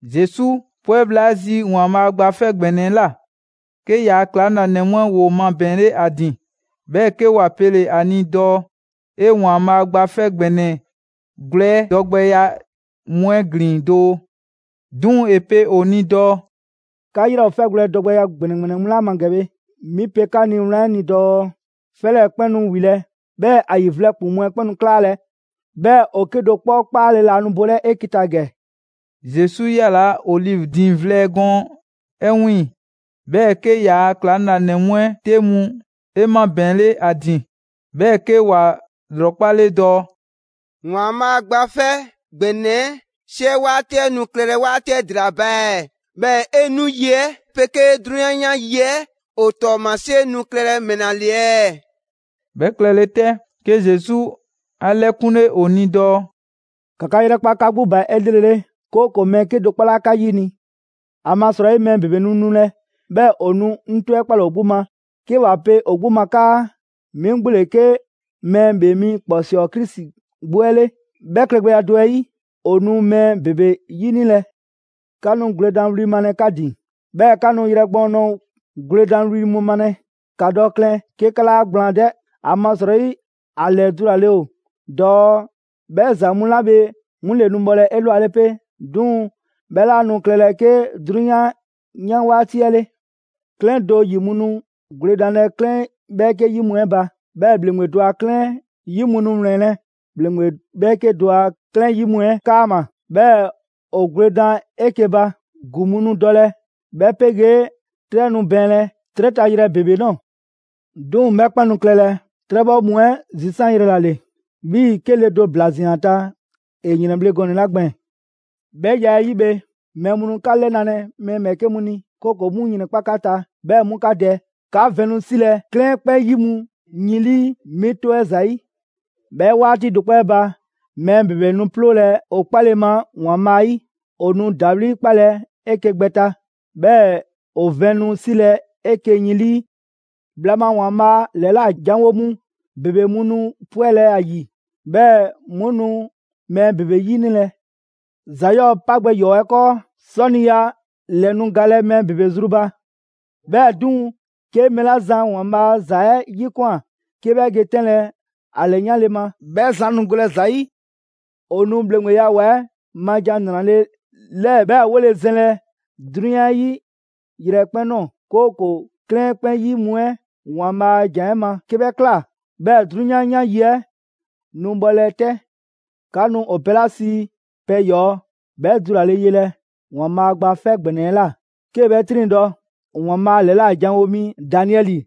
Zesu 'pwɛ bhla 'ɛ zi ‑Waanbhaa' Gba 'Fɛ ‑Gbɛnɛ 'ɛ ꞊la, 'ke yaa ‑klaŋlanɛ mu 'ɛ ‑woo mabɛɛnle ‑a ‑din, 'bhɛɛ‑ 'ke ‑wa pele‑ ‑a ni dɔɔ ‑e ‑Waanbhaa' Gba 'Fɛ ‑Gbɛnɛ gwlɛ 'ɛ dɔgbɛya mu 'ɛ ‑glin doo. 'Duŋ‑ ‑e pe ‑o ni dɔɔ: «'Ka 'yrɛ ‑o 'fɛgwlɛ‑ dɔgbɛya ‑gbɛnɛ ‑gbɛnɛ mu 'la ma ‑gɛ bhe, 'mi pe 'ka ni wlan 'ɛ ni dɔɔ 'fɛ 'lɛɛ‑ 'kpɛn nu ‑wilɛ', 'bhɛɛ‑ ‑a ‑yi vlɛ ‑kpuŋ mu 'ɛ 'kpɛn nu 'klaalɛ‑, 'bhɛɛ‑ ‑o 'kedo‑ 'kpɔ 'kpaale‑ laa nu bolɛ 'eke‑ ta ‑gɛ.» Zesu 'yalaa‑ Olivi diiŋ vlɛ gɔɔn 'ɛ 'wiiŋ‑. 'Bhɛɛ‑ 'ke ‑yaa' ‑klaŋlanɛ mu 'ɛ 'te 'mu 'e mabɛɛnle ‑a ‑din, 'bhɛɛ‑ 'ke ‑wa ‑lrɔkpale dɔɔ: «‑Waanbhaa' Gba 'Fɛ ‑Gbɛnɛ 'ɛ 'siɛ 'waati 'ɛ nu klɛlɛ 'waati 'ɛ ‑dela ba ɛɛ? 'Bhɛɛ‑ 'e 'nu yi 'ɛ 'pegee 'drunyan 'yan yi 'ɛ ‑o ‑tɔɔmasie nu klɛlɛ ‑mɛla ‑le ɛɛ?» 'Bhɛ klɛle 'tɛ, 'ke Zesu 'a 'lɛkunle ‑o ni dɔɔ: «‑Ka 'ka 'yrɛkpa 'ka 'gbu ba 'elrele, 'kooko‑ mɛɛ 'kedo‑ 'kpɔ 'laa 'ka 'yini‑. ‑Amasrɔyi mɛɛ ‑bebe nu nulɛ, 'bhɛɛ‑ ‑o nu 'ŋ 'tɔ 'ɛ 'kpalɛ‑ ‑o 'gbu ma, 'ke ‑wa pe ‑o 'gbu ma 'kaa: ‹'Mi 'gbu ‑le 'ke Mɛɛ ‑Bhee mi ‑kpɔsɔɔ Krisi 'gbu 'ɛ 'le!› 'Bhɛ klɛgbɛya 'ɛ 'yi, ‑o nu mɛɛ ‑bebe 'yinilɛ. 'Ka nu gwledanwli mu malɛ 'ka ‑din, 'bhɛɛ‑ 'ka nu yrɛ gbɔɔn ꞊nɔɔ gwledanwli mu malɛ. ‑Ka dɔ klɛn 'ke 'ka 'laa gblaan 'dɛ, ‑amasrɔyi ‑a ‑lɛdulale ‑o dɔɔ 'bhɛ ‑za mu 'la bhe 'mu ‑le nu bhɔlɛ 'elwale pe, 'duŋ‑ 'bhɛ 'laa nu klɛlɛ 'ke 'drunyan 'yan 'waati 'ɛ 'le. 'Klɛɛn do ‑yi mu nu gwledanlɛ 'klɛɛn 'bhɛɛke 'yi mu 'ɛ ba, 'bhɛɛ‑ ‑bhleŋgbe do a 'klɛɛn 'yi mu nu 'wlɛnlɛ‑ ‑bhleŋgbe 'bhɛɛke do a 'klɛɛn 'yi mu 'ɛ 'kaama‑, 'bhɛɛ‑ ‑o gwledan 'eke‑ ba. ‑Gu mu nu dɔlɛ, 'bhɛ 'pegee 'trɛ nu bɛɛnlɛ 'trɛ ta yrɛ ‑bebe ꞊nɔɔ. 'Duŋ‑ 'bhɛ 'kpɛn nu klɛlɛ 'trɛbhɔ mu 'ɛ zisanyrɛ ‑la ‑le, 'bhii‑ 'ke le do ‑bla ꞊zian ‑a ta ‑e ‑yrɛnbhle gɔnɛ‑ 'la gbɛɛn‑. 'Bhɛ ya 'ɛ 'yi bhe, mɛɛ mu nu 'ka 'lɛnalɛ mɛɛ ‑bhɛɛke' mu ni, 'kooko‑ 'mu ‑yrɛnkpa' 'ka ta, 'bhɛɛ‑ 'mu 'ka dɛ. 'Ka vɛn nu 'silɛ‑ 'klɛɛn 'kpɛn 'yi mu yin 'lii 'mi 'tɔ 'ɛ ‑zayi'. 'Bhɛ 'waati do 'kpɔ 'ɛ ba, mɛɛ ‑bebe nu 'ploolɛ‑ 'o 'kpale‑ ma ‑Waanbhaa' 'yi. ‑O nu ‑dawli' 'kpalɛ‑ 'eke‑ gbɛ ta, 'bhɛɛ‑ ‑o vɛn nu 'silɛ‑ 'eke‑ yin 'lii. Bhla ma ‑Waanbhaa' ‑lɛla' janwo mu ‑bebe mu nu 'pwɛlɛ‑ ‑a ‑yi, 'bhɛɛ‑ 'mu nu mɛɛ ‑bebe 'yinilɛ. ‑Za 'yɔɔ‑ 'pa gbɛ ‑yɔɔ' 'ɛ 'kɔɔ, 'sɔniya ‑lɛ nu galɛ mɛɛ ‑bebe zru ba. 'Bhɛɛ‑ 'duŋ‑, 'ke mɛɛ 'la zan ‑Waanbhaa' a ‑za 'ɛ 'yikwan꞊ 'ke 'bhɛ ge 'tɛnlɛ‑ ‑a ‑lɛyanle ma, 'bhɛ zan nu golɛ ‑za 'yi. ‑O nu ‑bhleŋgbeya ‑wa 'ɛ ma ‑Jan ‑Nrale' 'lɛɛ 'bhɛ 'wole‑ zɛnlɛ 'drunyan 'ɛ 'yi yrɛkpɛn‑ ꞊nɔɔ, 'kooko‑ 'klɛɛn 'kpɛn 'yi mu 'ɛ ‑Waanbhaa' a ‑jan 'ɛ ma. 'Ke 'bhɛ ꞊kla, 'bhɛɛ‑ 'drunyan 'yan yi 'ɛ nu bhɔlɛ 'tɛ.» «'Ka nu ‑o pɛ 'la sii ‹Pɛ ‑yɔɔ'› 'bhɛ dulale yelɛ ‑Waanbhaa' Gba 'Fɛ ‑Gbɛnɛ 'ɛ ꞊la 'kee‑ 'bhɛ 'triŋdɔ‑. ‑Waanbhaa' ‑lɛla' ‑janwo' mi Daniɛli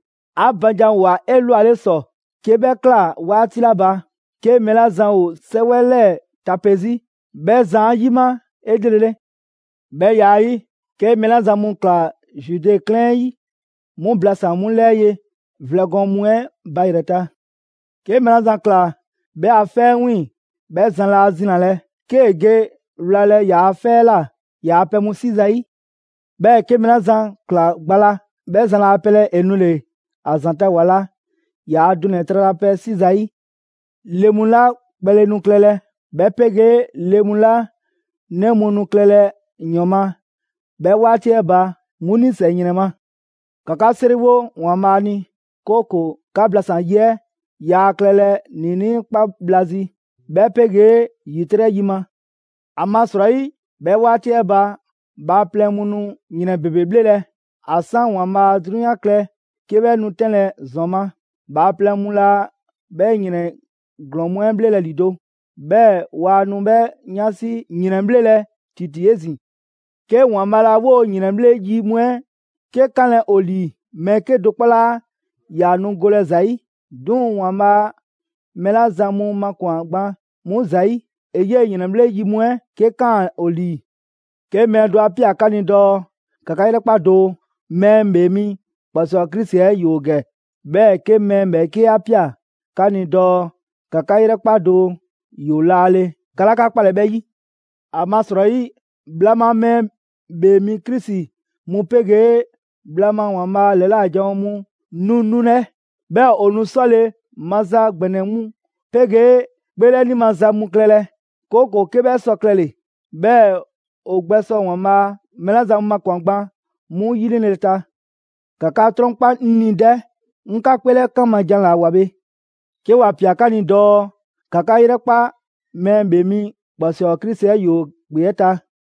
‑a ba ‑janwoa 'elwale ‑sɔ. 'Ke 'bhɛ ꞊kla 'waati 'la ba, 'ke mɛɛ 'la zan ‑o 'sɛwɛ 'lɛɛ‑ tape 'zi, 'bhɛ zan 'a 'yima 'elrele. 'Bhɛ ya 'ɛ 'yi, 'ke mɛɛ 'la zan mu ꞊kla Zude 'klɛɛn 'ɛ 'yi, 'mu blasan‑ 'mu 'lɛɛ ye vlɛ gɔɔn mu 'ɛ ba yrɛ ta; 'ke mɛɛ 'la zan ꞊kla 'bhɛ a 'fɛ 'ɛ 'wiiŋ‑, 'bhɛ zan laa zinalɛ, 'kee‑ ge wlalɛ ‑yaa' 'fɛ 'ɛ ꞊la ‑yaa' pɛ mu 'si zayi'. 'Bhɛɛ‑ 'ke mɛɛ 'la zan ꞊kla gba la, 'bhɛ zan laa pelɛ ‑e nule‑ ‑a ‑zanta' ‑wa la ‑yaa' dunɛ‑ tralapɛ 'si zayi'. Le mu 'la kpɛle nu klɛlɛ, 'bhɛ 'pegee le mu 'la 'nɛ mu nu klɛlɛ ‑yɔn ma 'bhɛ 'waati 'ɛ ba, 'mu 'nisɛ‑ ‑yrɛn ma! ‑Ka 'ka 'seriwo ‑Waanbhaa' ni, 'kooko‑ 'ka blasan‑ yi 'ɛ yaa klɛlɛ ‑niinii' 'kpa bhla zi, 'bhɛ 'pegee ‑yitrɛ' yi ma. ‑Amasrɔyi, 'bhɛ 'waati 'ɛ ba, bhaaplɛŋ mu nu ‑yrɛn ‑bebe 'bhlelɛ‑. ‑A 'san ‑Waanbhaa' 'drunyan klɛ 'ke 'bhɛ nu 'tɛnlɛ‑ ‑zɔn ma, bhaaplɛŋ mu laa 'bhɛ ‑yrɛn ‑glɔɔn mu 'ɛ bhlelɛ ‑lido', 'bhɛɛ‑ waa nu 'bhɛ 'yansi ‑yrɛnbhlelɛ ‑titi 'ezin‑. 'Ke ‑Waanbhaa' laa 'woo‑ ‑yrɛnbhle' yi mu 'ɛ 'ke 'kanlɛ‑ ‑o ‑lii, mɛɛ 'kedo‑ 'kpɔ 'laa ‑yaa nu golɛ ‑za 'yi. 'Duŋ‑ ‑Waanbhaa' mɛɛ 'la zan mu makwan‑ gban 'mu ‑zayi', ‑e 'yee‑ ‑yrɛnbhle' yi mu 'ɛ 'ke 'kaan‑ ‑o ‑lii.» «'Ke mɛɛ do 'a ꞊pia 'ka ni dɔɔ: ‹‑Ka 'ka 'yrɛkpa doo, Mɛɛ ‑Bhee Mi ‑kpɔsɔɔ Krisi 'ɛ ‑yoo ‑gɛ!› 'Bhɛɛ‑ 'ke mɛɛ ‑bhɛɛke' 'a ꞊pia 'ka ni dɔɔ: ‹‑Ka 'ka 'yrɛkpa doo, ‑yoo laale!› 'Ka 'laa 'ka 'kpalɛ‑ 'bhɛ 'yi. ‑Amasrɔyi bhla ma mɛɛ ‑bhee mi Krisi mu 'pegee bhla ma ‑Waanbhaa' ‑lɛla' janwo mu nu nulɛ, 'bhɛɛ‑ ‑o nu 'sɔle‑ maza ‑gbɛnɛ mu 'pegee 'kpeelɛni maza mu klɛlɛ, 'kooko‑ 'ke 'bhɛ sɔ klɛle‑, 'bhɛɛ‑ ‑o gbɛsɔ ‑Waanbhaa' mɛɛ 'la zan mu makwan‑ gban 'mu ‑yinile ta. ‑Ka 'ka 'trɔnkpa 'ŋ ni 'dɛ! 'Ŋ 'ka 'kpeelɛkan ma jan ‑la ꞊woa bhe. «'Ke ‑wa ‑pia 'ka ni dɔɔ: ‹‑Ka 'ka 'yrɛkpa Mɛɛ ‑Bhee Mi ‑kpɔsɔɔ Krisi 'ɛ ‑yoo ‑kpe 'ɛ ta›.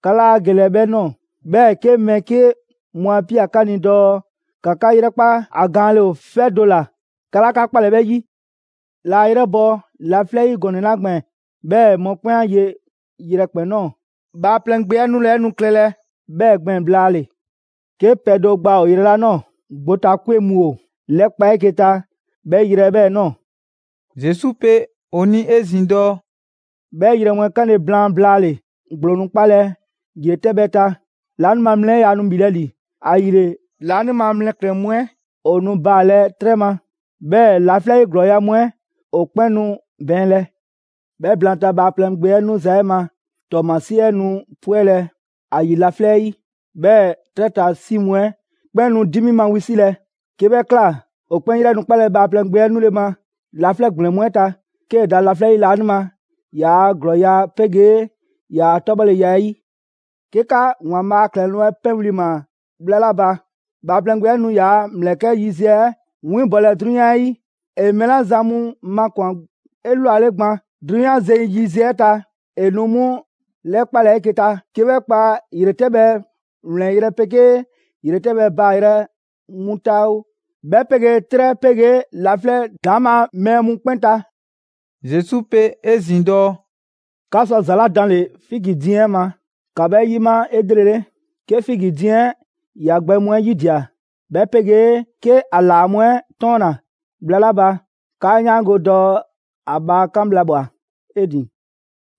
'Ka 'laa gelɛ 'bhɛ ꞊nɔɔ; 'bhɛɛ‑ 'ke mɛɛ 'ke mu 'a ꞊pia 'ka ni dɔɔ: ‹‑Ka 'ka 'yrɛkpa, ‑a gaanle ‑o 'fɛ do ‑la, 'ka 'laa 'ka 'kpalɛ‑ 'bhɛ 'yi›. La 'a 'yrɛbɔ‑ laflɛ' 'yi gɔnɛ‑ 'la gbɛɛn‑ 'bhɛɛ‑ mɔkpɛn' 'a ye yrɛkpɛn‑ ꞊nɔɔ, Bhaaplɛŋ Gbe 'ɛ nu nule 'ɛ nu klɛlɛ 'bhɛɛ‑ gbɛɛn‑ blaale‑. 'Ke pɛ do gbaa ‑o yrɛ 'la ꞊nɔɔ, gbotakwe mu ‑o ‑lɛkpa' 'eke‑ ta 'bhɛ yrɛ 'ɛ 'bhɛɛ‑ ꞊nɔɔ.» Zesu pe ‑o ni 'ezin‑ dɔɔ: «'Bhɛ ‑yrɛn mu 'ɛ 'kanle‑ blaan blaale‑, ‑gblo nu 'kpalɛ‑ ‑yretɛbhɛ ta, laanima mlɛ 'ɛ yaa nu ‑bhilɛ' ‑li. ‑Ayile laanima mlɛklɛn‑ mu 'ɛ ‑o nu baalɛ 'trɛ ma, 'bhɛɛ‑ laflɛ' 'yi ‑glɔɔya' mu 'ɛ ‑o 'kpɛn nu bɛɛnlɛ. 'Bhɛ blaanta, Bhaaplɛŋ Gbe 'ɛ 'nuza‑ 'ɛ ma ‑tɔɔmasie 'ɛ nu 'pwɛlɛ‑ ‑a ‑yi laflɛ' 'yi; 'bhɛɛ‑ 'trɛ ta 'si mu 'ɛ 'kpɛn nu 'dimi ma wisilɛ; 'ke 'bhɛ ꞊kla, ‑o 'kpɛn 'yrɛ nu 'kpalɛ‑ Bhaaplɛŋ Gbe 'ɛ 'nule‑ ma laflɛ' ‑gblɛn mu 'ɛ ta, 'kee‑ da laflɛ' 'yi laanima ‑yaa' ‑glɔɔya' 'pegee ‑yaa' 'tɔbhɔleya 'ɛ 'yi. 'Ke 'ka ‑Waanbhaa' a ‑klɛloŋ' 'ɛ 'pɛnwli‑ ꞊maa bhla 'la ba, Bhaaplɛŋ Gbe 'ɛ nu ‑yaa' ‑mlɛkɛ' yiziɛ 'ɛ 'winbɔlɛ 'drunyan 'ɛ 'yi, ‑e mɛɛ 'la zan mu makwan‑ 'elwale gban 'drunyan zeŋ yiziɛ 'ɛ ta, ‑e nu 'mu ‑lɛkpalɛ 'eke‑ ta: 'Ke 'bhɛ kpa ‑yretɛbhɛ ‑wlɛnyrɛ' 'pegee ‑yretɛbhɛ baayrɛ mu ta oo, 'bhɛ 'pegee 'trɛ 'pegee laflɛ' ‑daŋma' mɛɛ mu 'kpɛn ta.» Zesu pe 'ezin‑ dɔɔ: «'Ka sɔ za ‑la daanle‑ figi diiŋ 'ɛ ma, ‑ka 'bhɛ 'yima 'elrele. 'Ke figi diiŋ 'ɛ ‑ya gbɛ mu 'ɛ yidia‑, 'bhɛ 'pegee 'ke ‑a ‑laa mu 'ɛ 'tɔɔnna‑ bhla 'la ba, 'kaa 'yaango‑ dɔɔ ‑a bhaa 'kan bhla ꞊bhwa 'e ‑din.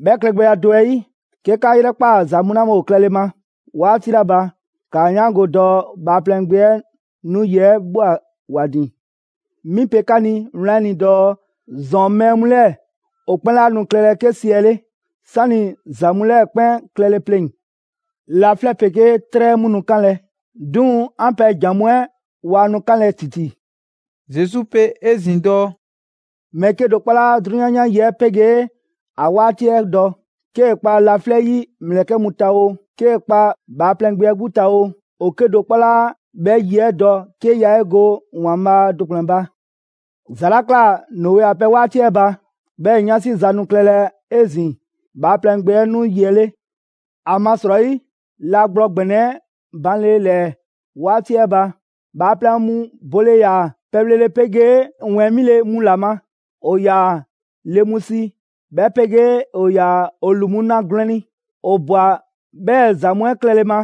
'Bhɛ klɛgbɛya do 'ɛ 'yi, 'ke 'ka 'yrɛkpaa‑ ‑za mu 'la bhe ‑o klɛle ma 'waati 'la ba, ‑kaa 'yaango‑ dɔɔ Bhaaplɛŋ Gbe 'ɛ nu yi 'ɛ ꞊bhwa ‑wa ‑din. 'Mi pe 'ka ni wlan 'ɛ ni dɔɔ ‑zɔn mɛɛ mu 'lɛɛ‑ ‑o 'kpɛn 'laa nu klɛlɛ 'ke siɛle', 'sani‑ ‑za mu 'lɛɛ‑ 'kpɛn klɛle pleŋ‑. Laflɛ' 'pegee 'trɛ mu nu 'kanlɛ‑, 'duŋ‑ 'an pɛ ‑jan mu 'ɛ waa nu 'kanlɛ‑ ‑titi.» Zesu pe 'ezin‑ dɔɔ: «Mɛɛ 'kedo‑ 'kpɔ 'laa 'drunyan 'yan yi 'ɛ 'pegee ‑a 'waati 'ɛ dɔ. 'Kee‑ kpa laflɛ' 'yi ‑mlɛkɛ' mu ta oo, 'kee‑ kpa Bhaaplɛŋ Gbe 'ɛ 'gbu ta oo, ‑o 'kedo‑ 'kpɔ 'laa 'bhɛ yi 'ɛ dɔ 'ke yaa 'e go ‑Waanbhaa' do ‑kplɛn ba. ‑Za 'la ꞊kla Noe a pɛ 'waati 'ɛ ba, 'bhɛɛ‑ 'yansi ‑za nu klɛlɛ 'ezin‑ Bhaaplɛŋ Gbe 'ɛ nu yi 'ɛ 'le. ‑Amasrɔyi, la gblɔ ‑gbɛnɛ 'ɛ banle ‑lɛɛ 'waati 'ɛ ba, bhaaplɛŋ mu bole ‑yaa pɛbhlele 'pegee ‑wɛɛn 'mile‑ mu ‑la ma, ‑o ‑yaa le mu si, 'bhɛ 'pegee ‑o ‑yaa ‑o ‑lu mu na gwlɛn ni. ‑O ꞊bwa 'bhɛɛ‑ ‑za mu 'ɛ klɛle ma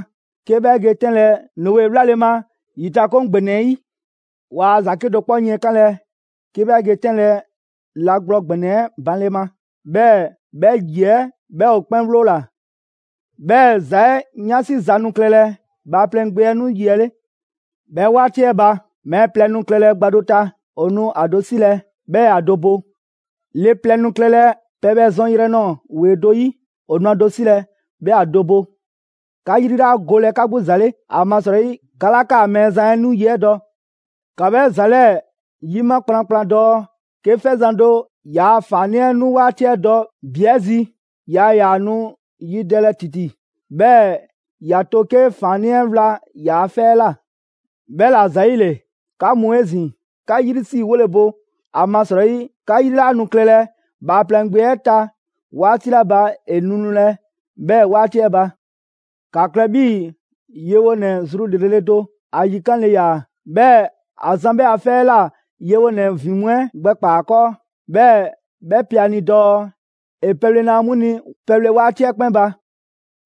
'ke 'bhɛ ge 'tɛnlɛ‑ Noe 'wlale‑ ma ‑yitakoŋ ‑gbɛnɛ 'ɛ 'yi. Waa ‑za 'kedo‑ 'kpɔ yiɛnkanlɛ 'ke 'bhɛ ge 'tɛnlɛ‑ la gblɔ ‑gbɛnɛ 'ɛ banle ma. 'Bhɛɛ‑, 'bhɛ ‑yi 'ɛ 'bhɛ ‑o 'kpɛn 'wloola‑; 'bhɛɛ‑ ‑za 'ɛ 'yansi za nu klɛlɛ Bhaaplɛŋ Gbe 'ɛ 'nu yi 'ɛ 'le. 'Bhɛ 'waati 'ɛ ba, mɛɛ plɛ nu klɛlɛ gba do ta, ‑o nu ‑a do 'silɛ‑, 'bhɛɛ‑ ‑a do bo. Le plɛ nu klɛlɛ pɛbhɛ zɔn yrɛ ꞊nɔɔ ‑wee do 'yi, ‑o nu ‑a do 'silɛ‑, 'bhɛɛ‑ ‑a do bo. 'Ka 'yri 'laa golɛ 'ka 'gbu ‑za 'le, ‑amasrɔyi 'ka 'laa 'kaa‑ Mɛɛzan 'ɛ nu 'yi 'ɛ dɔ. ‑Ka 'bhɛ ‑za 'lɛɛ‑ 'yima kplankplan dɔɔ: 'Ke 'fɛzan‑ do ‑yaa ‑faannii' 'ɛ nu 'waati 'ɛ dɔ ‑bi 'ɛ zi, yaa ‑yaa nu yidɛlɛ ‑titi, 'bhɛɛ‑ ‑ya to 'ke ‑faannii' 'ɛ wla ‑yaa' 'fɛ 'ɛ ꞊la. 'Bhɛla‑ ‑zayile, 'ka mu 'ezin‑, 'ka 'yrisriwole bo, ‑amasrɔyi 'ka 'yri 'laa nu klɛlɛ Bhaaplɛŋ Gbe 'ɛ ta 'waati 'la ba ‑e nu nulɛ 'bhɛɛ‑ 'waati 'ɛ ba.» «‑Ka klɛ 'bhii‑ yewonɛ zru 'lrele‑ do. ‑A yikanle ‑yaa, 'bhɛɛ‑ ‑a zan 'bhɛ a 'fɛ 'ɛ ꞊la yewonɛ ‑vin mu 'ɛ gbɛkpaa‑ ‑a 'kɔɔ. 'Bhɛɛ‑ 'bhɛ pe ‑a ni dɔɔ ‑e pɛle na 'mu ni pɛbhle 'waati 'ɛ 'kpɛn ba.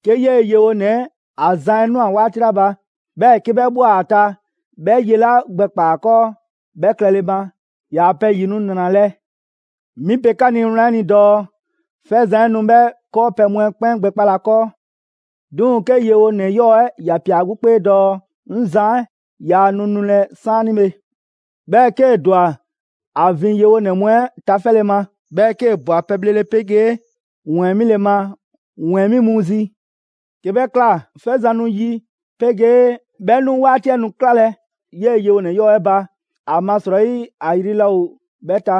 'Ke 'yee‑ yewonɛ 'ɛ ‑a zan 'ɛ ꞊nwa 'waati 'la ba, 'bhɛɛ‑ 'ke 'bhɛ ꞊bhwa ‑a ta 'bhɛ ye 'la gbɛkpaa‑ ‑a ‑kɔɔ 'bhɛ klɛle ma, ‑yaa' pɛ ‑yi nu ‑nralɛ'! Mi pe 'ka ni wlan 'ɛ ni dɔɔ 'fɛzan‑ 'ɛ nu 'bhɛ 'kɔɔpɛ‑ mu 'ɛ 'kpɛn gbɛkpalɛ ‑a 'kɔɔ. 'Duŋ‑ 'ke yewonɛ 'yɔɔ‑ 'ɛ ‑ya ꞊pia ‑a 'gbu 'kpee dɔɔ: ‹'Ŋ zan 'ɛ yaa nu nulɛ 'saanibhe.› Bhɛɛ‑ 'kee‑ ‑dwa ‑a ‑vin yewonɛ mu 'ɛ tafɛle ma, 'bhɛɛ‑ 'kee‑ ꞊bwa pɛbhlele 'pegee ‑wɛɛn 'mile‑ ma ‑wɛɛn 'mi mu zi. 'Ke 'bhɛ ꞊kla, 'fɛzan‑ 'nu yi 'pegee 'bhɛ 'nu 'waati 'ɛ nu 'klalɛ‑ 'yee‑ yewonɛ 'yɔɔ‑ 'ɛ ba, ‑amasrɔyi ‑a yri laa ‑o 'bhɛ ta,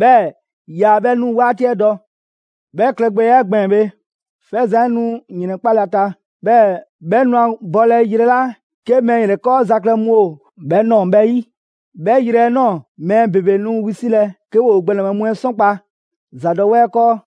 'bhɛɛ‑ yaa 'bhɛ 'nu 'waati 'ɛ dɔ. 'Bhɛ klɛgbɛya 'ɛ gbɛɛn‑ bhe, 'fɛzan‑ 'ɛ nu ‑yrɛnkpalɛ ‑a ta, 'bhɛɛ‑ 'bhɛ nu ‑a bɔlɛ yrɛ 'la 'ke mɛɛ ‑yrɛkɔɔza klɛ mu ‑o 'bhɛ ꞊nɔɔ 'bhɛ 'yi. 'Bhɛ yrɛ 'ɛ ꞊nɔɔ mɛɛ ‑bebe nu wisilɛ, 'ke ‑woo gbɛnɛbhɛ mu 'ɛ 'sɔnkpa‑ ‑zadɔwɛɛ 'kɔɔ.»